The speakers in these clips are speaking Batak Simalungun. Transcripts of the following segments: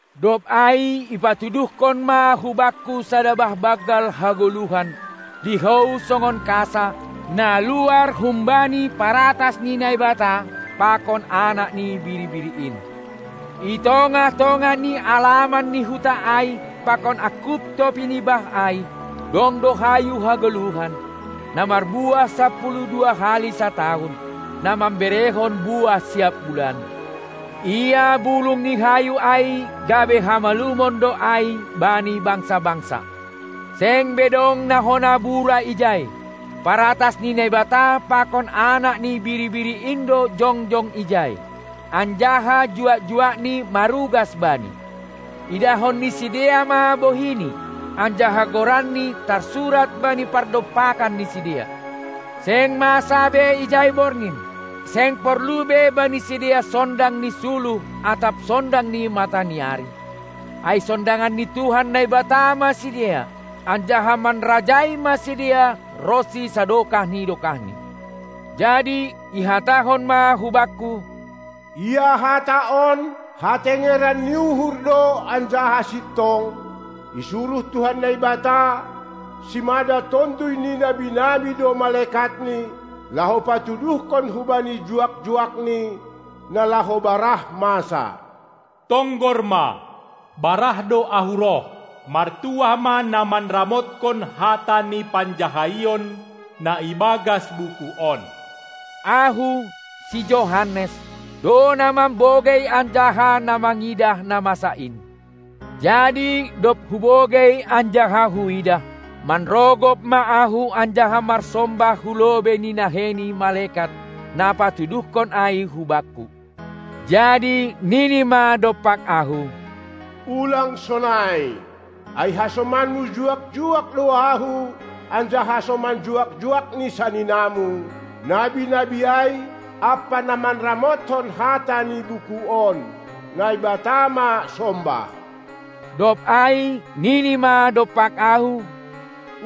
Dob ai ipatuduhkon ma hubakku sada bah banggal hagoluhan, lihou songon kasa, na luar humbani paratas ni Naibata pakon Anak ni Biri-biri in. I tongah-tongah ni alaman ni huta ai pakon angkup topi ni bah ai, dong do hayu hagoluhan, na marbuah sapuluh dua hali satahun, na mamberehon buah siap bulan; ia bulung ni hayu ai gabe hamalumon do ai bani bangsa-bangsa. Seng be dong na hona bura ijai. Paratas ni Naibata pakon Anak ni Biri-biri in do jongjong ijai, anjaha juak-juakNi marugas Bani. Idahon ni sidea ma bohiNi, anjaha goranNi tarsurat bani pardompakan ni sidea. Seng masa be ijai borgin, seng porlu be bani sidea sondang ni suluh atap sondang ni mata ni ari, ai sondangan ni Tuhan Naibata ma sidea, anjaha manrajai ma sidea ronsi sadokah ni dokahni. Jadi ihatahon ma hubakku: Ia hata on hatengeran ni uhur do anjaha sintong; isuruh Tuhan Naibata, simada tonduy ni nabi-nabi do malekatNi, laho patuduhkon hubani juak-juakNi na laho barah masa. Tonggor ma, barah do Ahu roh! Martuah ma na manramotkon hata ni panjahaion na ibagas buku on! Ahu, si Johannes, do na mambogei anjaha na mangidah na masa in. Jadi dob hubogei anjaha huidah, manrogop ma ahu anjaha marsombah hulobei ni nahei ni malekat, na patuduhkon ai hubakku. Jadi nini ma dompak ahu: Ulang sonai! Ai hasomanmu juak-juak do ahu anjaha hasoman juak-juak ni saninamu, nabi-nabi ai, ampa na manramothon hata ni buku on. Naibata ma sombah! Dob ai nini ma dompak ahu: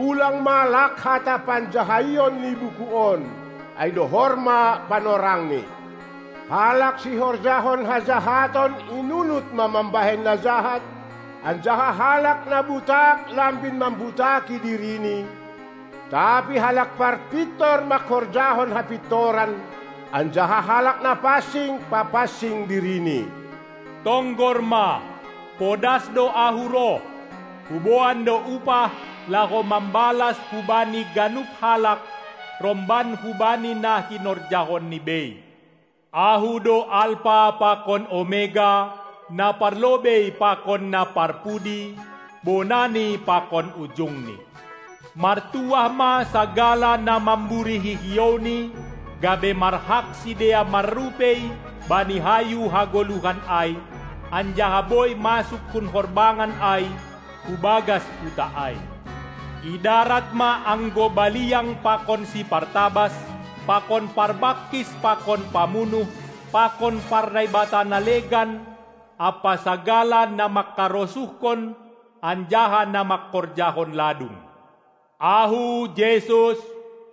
Ulang ma lak hata panjahaion ni buku on! Ai dohor ma panorangni. Halak sihorjahon hajahaton inunut ma mambahen na jahat, anjaha halak na butak lambin mambutaki dirini; tapi halak parpintor manghorjahon hapintoran, anjaha halak na pansing papansing dirini. Tonggor ma, podas do Ahu roh! Huboan do upah, laho mambalas hubani ganup halak romban hubani na hinorjahonni bei. Ahu do Alpa pakon Omega, Na parlobei pakon Na parpudi, Bonani pakon Ujungni. Martuah ma sagala na mamburihi hiouni, gabe marhak sidea marrupei bani hayu hagoluhan ai, anjaha boi masuk hun horbangan ai hubagas huta ai. I darat ma anggo baliang pakon sipartabas pakon parbangkis pakon pamunuh pakon parnaibata na legan ampa sagala na mangkarosuhkon anjaha na mangkorjahon ladung. Ahu, Jesus,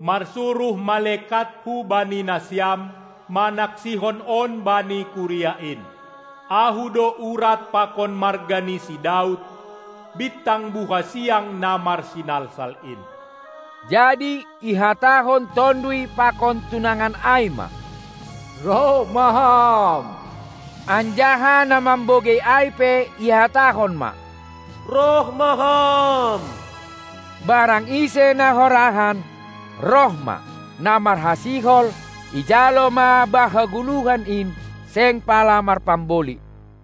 marsuruh malekatHu bani nasiam, manaksihon on bani kuria in. Ahu do Urat pakon marga ni si Daud, Bintang buha siang, na marsinalsal in. Jadi ihatahon Tonduy pakon tunangan ai ma: Roh ma Ham! Anjaha na mambogei ai pe ihatahon ma: Roh ma Ham! Barang ise na horahan, roh ma; na marhasihol, ijalo ma bah hagoluhan in seng pala marpamboli.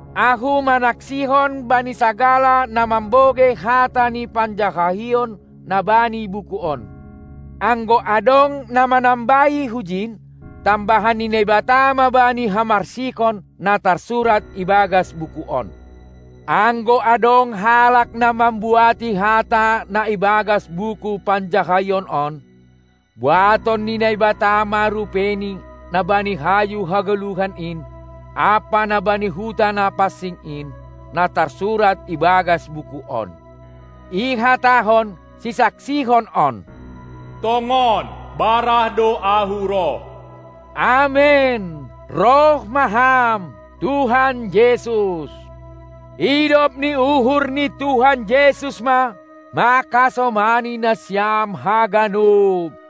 Ahu manaksihon bani sagala na mambogei hata ni panjahaion na bani buku on: Anggo adong na manambahi hujin, tambahan ni Naibata ma bani hamarsikon na tarsurat ibagas buku on. Anggo adong halak na mambuati hata na ibagas buku panjahaion on, buaton ni Naibata ma rupeini na bani hayu hagoluhan in ampa na bani huta na pansing in, na tarsurat ibagas buku on. Ihatahon sisaksihon on: Tongon, barah do Ahu roh! Amen! Roh ma Ham, Tuhan Jesus! Idop ni uhur ni Tuhan Jesus ma manghasomani nasiam haganup!